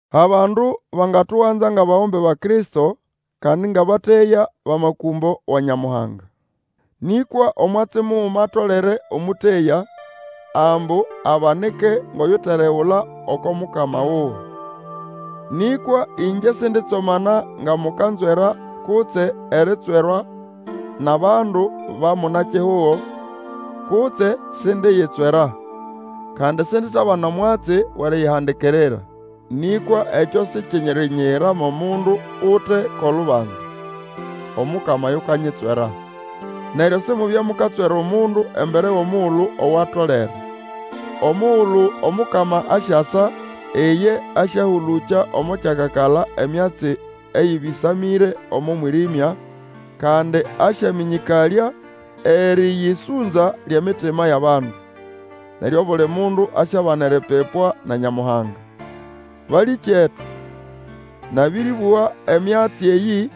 Abandu bangatuganza ngʼabagombe ba Kristo, kandi ngʼabateya bʼamakũmbo wa Nyamuhanga. Nĩkwa omwatsi muguma atolere omũteya, ambu abanike ngʼoyuteregula oko mukama wuwe. Nĩkwa ĩngye sinditsomana nga mukanzwera kutse eritswerwa nʼabandu ba muna-kihugo. Kutse sindiyitswera. Kandi sinditabana omwatsi wʼeriyihandikirira. Nĩkwa ekyo sikirinyiyira mo mundu ute ko lubanza. Omukama yukanyitswera. Neryo Simubye mukatswera omundu embere wʼomugulu owatolere, omugulu Omukama asyasa, iye asyahũlũkya omo kyakakala emyatsi eyĩbĩsamĩre omo mwĩrĩmya, kandi asyamĩnyĩkalya erĩyĩsũnza lyʼemitima yʼabandu. Neryo obuli mundu asyabana eripipwa na Nyamuhanga. Balĩkyetu, nabĩrĩbũga emyatsi eyĩ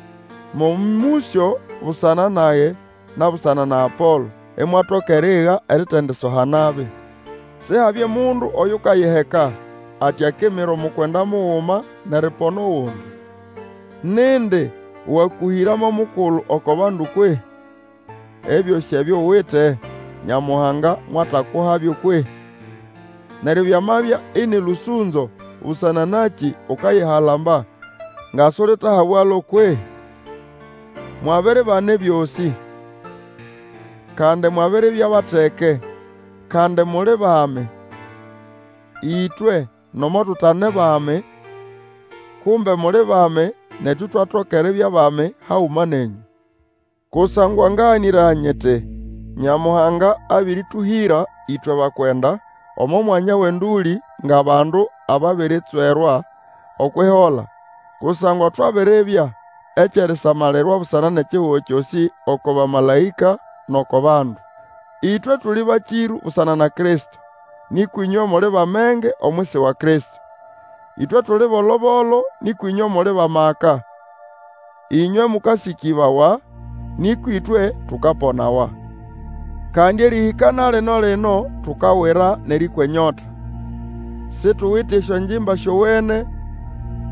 mo mũsyo busana nage na busana na Apolo, imwatoka eriiga eritendisoha nabi. Sihabye mundu oyukayiheka, ati akimira omukwenda muguma, nʼeripona ogundi. Nindi wakũhĩra mo mukulu oko bandu kwehĩ? Ebyosĩ ebyo uwite, Nyamuhanga mwatakuhabyo kwehĩ? Neryo byamabya ĩnĩ lũsũnzo, busana nakĩ ukayihalamba nga sulitahabwalo kwehĩ? Mwabiribana ebyosĩ; kandi mwabiribya bateke, kandi muli bami, ĩtwe nomo tutane bami; kumbe muli bami, netu itwatoka eribya bami haguma nenyũ. Kusangwa ngaganĩraya nyiti, Nyamuhanga abĩrĩtũhĩra ĩtwe bakwenda, omo mwanya wʼendũlĩ, ngʼabandu ababiritswerwa okwʼihola, kusangwa twabiribya ekyʼerisamalirwa busana nʼekihugo kyosĩ, oko bamalaĩka, nʼoko bandu. Ĩtwe tuli bakĩrũ busana na Kristo, nĩkwa ĩnywe muli bʼamenge omwisi wa Kristo; ĩtwe tuli bolo-bolo, nĩkwa ĩnywe muli bʼamaka; ĩnywe mũkasĩkĩbawa, nĩkwa ĩtwe tukaponawa. Kandi erĩhĩka na lino-lino tukawira nʼerĩkwa enyota, situwite esyongimba syowene,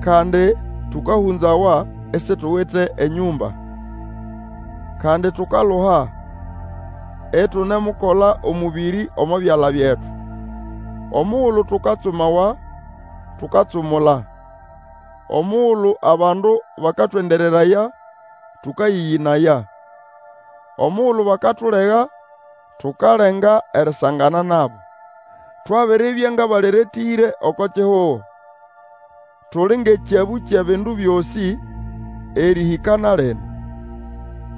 kandi tũkahũnzawa, isituwite enyũmba. Kandi tukaluha, itunemukola omũbĩrĩ omo byala byetu. Omugulu tukatsumawa, tukatsumula; omugulu abandu bakatwendereraya, tũkayĩyĩnaya. Omugulu bakatulega, tukalenga erisangana nabo. Twabiribya ngʼabaleretĩre oko kihugo, tuli ngʼekyabũ kyʼebindu byosĩ, erĩhĩka na lino.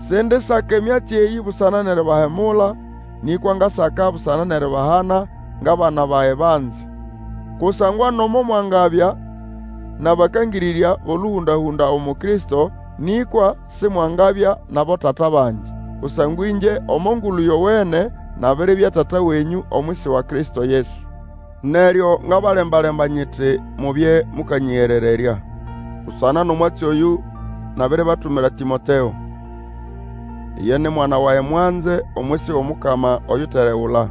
Sindisaka emyatsi eyĩ busana nʼeribahemula, nĩkwa ngasaka busana nʼeribahana ngʼabana bage banze. Kusangwa nomo mwangabya nʼabakangĩrĩrya bʼolũhũnda-hũnda umu Kristo, nĩkwa simwangabya nʼabotata bangi. Kusangwa ĩngye omo Ngulu Yowene nabiribya tata wenyũ omwisi wa Kristo Yesu. Neryo ngabalemba-lemba nyiti mubye mukanyĩgerererya. Busana nʼomwatsi oyũ, nabiribatumira Tĩmoteo. Iye ni mwana wage mwanze omwisi wʼOmukama oyuteregula.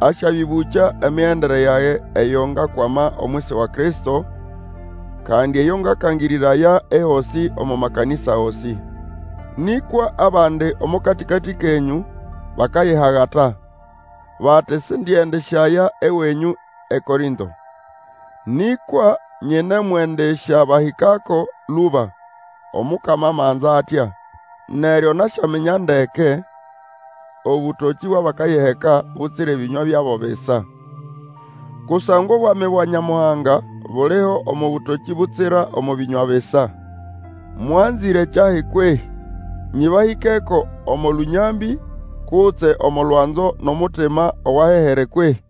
Asyabĩbũkya emigendere yage eyo ngakwama omwisi wa Kristo, kandi eyo ngakangĩrĩraya ehosĩ omo makanĩsa gosĩ. Nĩkwa abandi omo katĩkatĩ kenyũ bakayihagata, bati Sindiendisyaya ewenyũ eKorĩnto. Nĩkwa nyinemwendĩsyabahĩkako lũba, Omukama amanza atya, neryo nasyaminya ndeke obũtokĩ bwʼabakayiheka, butsira ebĩnywa byabo bisa. Kusangwa obwami bwa Nyamuhanga buliho omo bũtokĩ butsira omo bĩnywa bisa. Mwanzĩre kyahi kwehĩ? Nyĩbahĩkeko omo lũnyambĩ, kutse omo lwanzo nʼomutima owahehere kwehĩ?